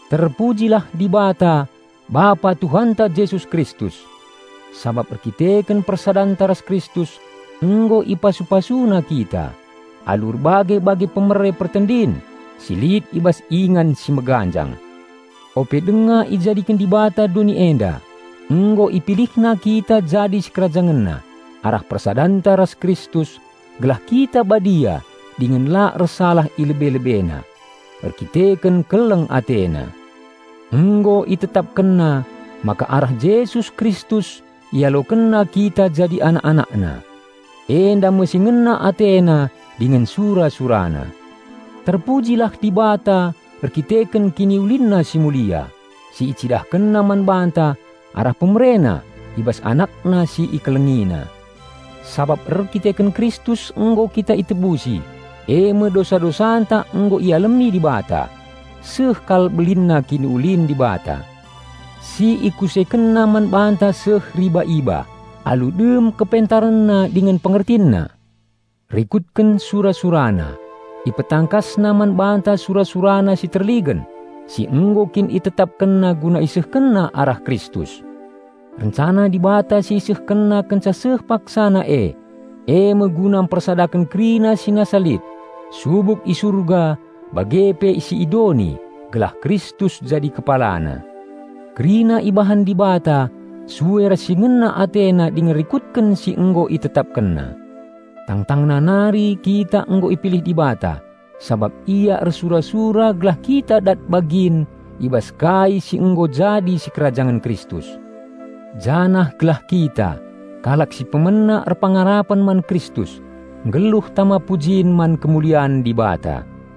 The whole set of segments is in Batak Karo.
Terpujilah Dibata Bapa Tuhanta Jesus Kristus! Sabap erdandanken persadanta ras Kristus, nggo ipasu-PasuNa kita, alu erbage-bage pemere pertendin si lit i bas ingan si meganjang. Ope denga ijadiken Dibata doni enda, nggo IpilihNa kita jadi SikerajangenNa arah persadanta ras Kristus gelah kita badia dingen la ersalah i lebe-LebeNa. Erdandanken keleng AteNa. Nggo ItetapkenNa maka arah Jesus Kristus IalokenNa kita jadi anak-AnakNa. Enda me si ngena AteNa dingen sura-SuraNa. Terpujilah Dibata erdandanken KiniulinNa si mulia, si IcidahkenNa man banta arah PemereNa i bas AnakNa si IkelengiNa. Sabap erdandanken Kristus nggo kita itebusi, eme dosa-dosanta nggo ialemi Dibata. Seh kal belinna kiniulin Dibata. Si IkusekenNa man banta seh riba-iba, alu dem KepentarenNa dingen PengertinNa. Rikutken sura-SuraNa, IpetangkasNa man banta sura-SuraNa si terligen, si nggo kin ItetapkenNa guna IsehkenNa arah Kristus. Rencana Dibata si IsehkenNa kenca seh paksana e, eme guna mpersadaken kerina si nasa lit, subuk i Surga bage pe si i doni, gelah Kristus jadi kepalana. Kerina ibahan Dibata sue ras si ngena AteNa dingen rikutken si nggo ItetapkenNa. Tangtangna nari kita nggo ipilih Dibata sabap Ia ersura-sura gelah kita dat bagin i bas kai si nggo jadi sikerajangen Kristus. Janah gelah kita, kalak si pemena erpengarapen man Kristus, nggeluh tama pujin man kemulian Dibata.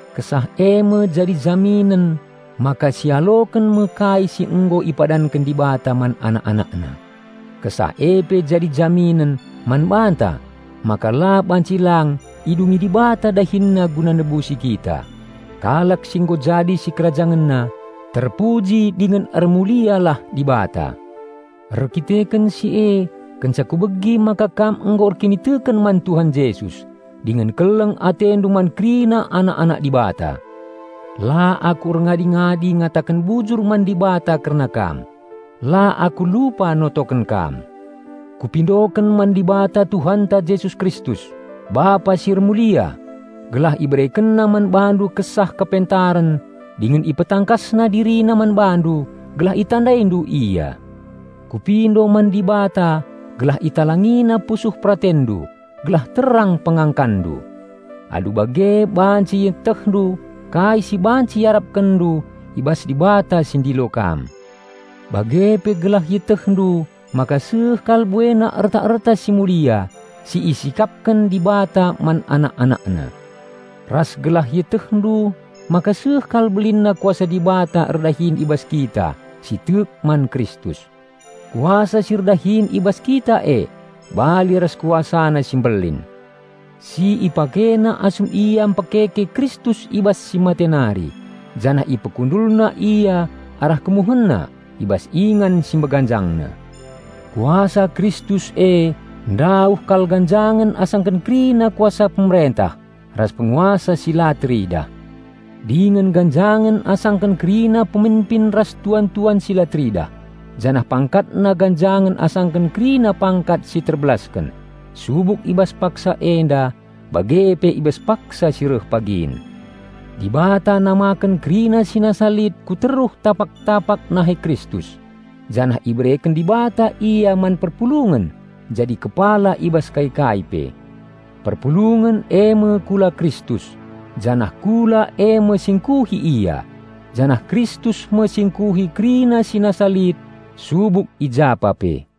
Kesah eme jadi jaminen maka sialoken me kai si nggo ipadanken Dibata man anak-AnakNa. Kesah e pe jadi jaminen man banta maka la banci lang idungi Dibata DahinNa guna nebusi kita, kalak si nggo jadi SikerajangenNa. Terpuji dingen ermulialah Dibata. Erdandanken si e, kenca kubegi maka kam nggo erkiniteken man Tuhan Jesus, dingen keleng atendu man kerina anak-anak Dibata. La aku erngadi-ngadi ngataken bujur man Dibata kerna kam. La aku lupa notoken kam. Kupindoken man Dibata Tuhanta Jesus Kristus, Bapa si ermulia, gelah IberekenNa man bandu kesah kepentaren dingen IpetangkasNa DiriNa man bandu gelah itandaindu Ia. Kupindo man Dibata gelah ItalangiNa pusuh peratenndu gelah terang pengangkanndu. Alu bage banci ietehndu kai si banci iarapkenndu i bas Dibata si ndilo kam, bage pe gelah ietehndu maka seh kal buena erta-erta si mulia si isikapken Dibata man anak-AnakNa. Ras gelah ietehndu maka seh kal belinna Kuasa Dibata erdahin i bas kita si tek man Kristus. Kuasa si erdahin i bas kita e, bali ras KuasaNa si mbelin. Si IpakeNa asum Ia mpekeke Kristus i bas si mate nari, janah IpekundulNa Ia arah KemuhenNa i bas ingan si meganjangna. Kuasa Kristus e ndauh kal ganjangen asangken kerina kuasa pemerentah ras penguasa si la teridah, dingen ganjangen asangken kerina peminpin ras tuan-tuan si la teridah, janah PangkatNa ganjangen asangken kerina pangkat si terbelasken, subuk i bas paksa enda, bage pe i bas paksa si reh pagin. Dibata nameken kerina si nasa lit ku teruh tapak-tapak nahe Kristus, janah ibereken Dibata Ia man perpulungen jadi kepala i bas kai-kai pe. Perpulungen eme kula Kristus, janah kula eme si ngkuhi Ia, janah Kristus me si ngkuhi kerina si nasa lit subuk i japa pe.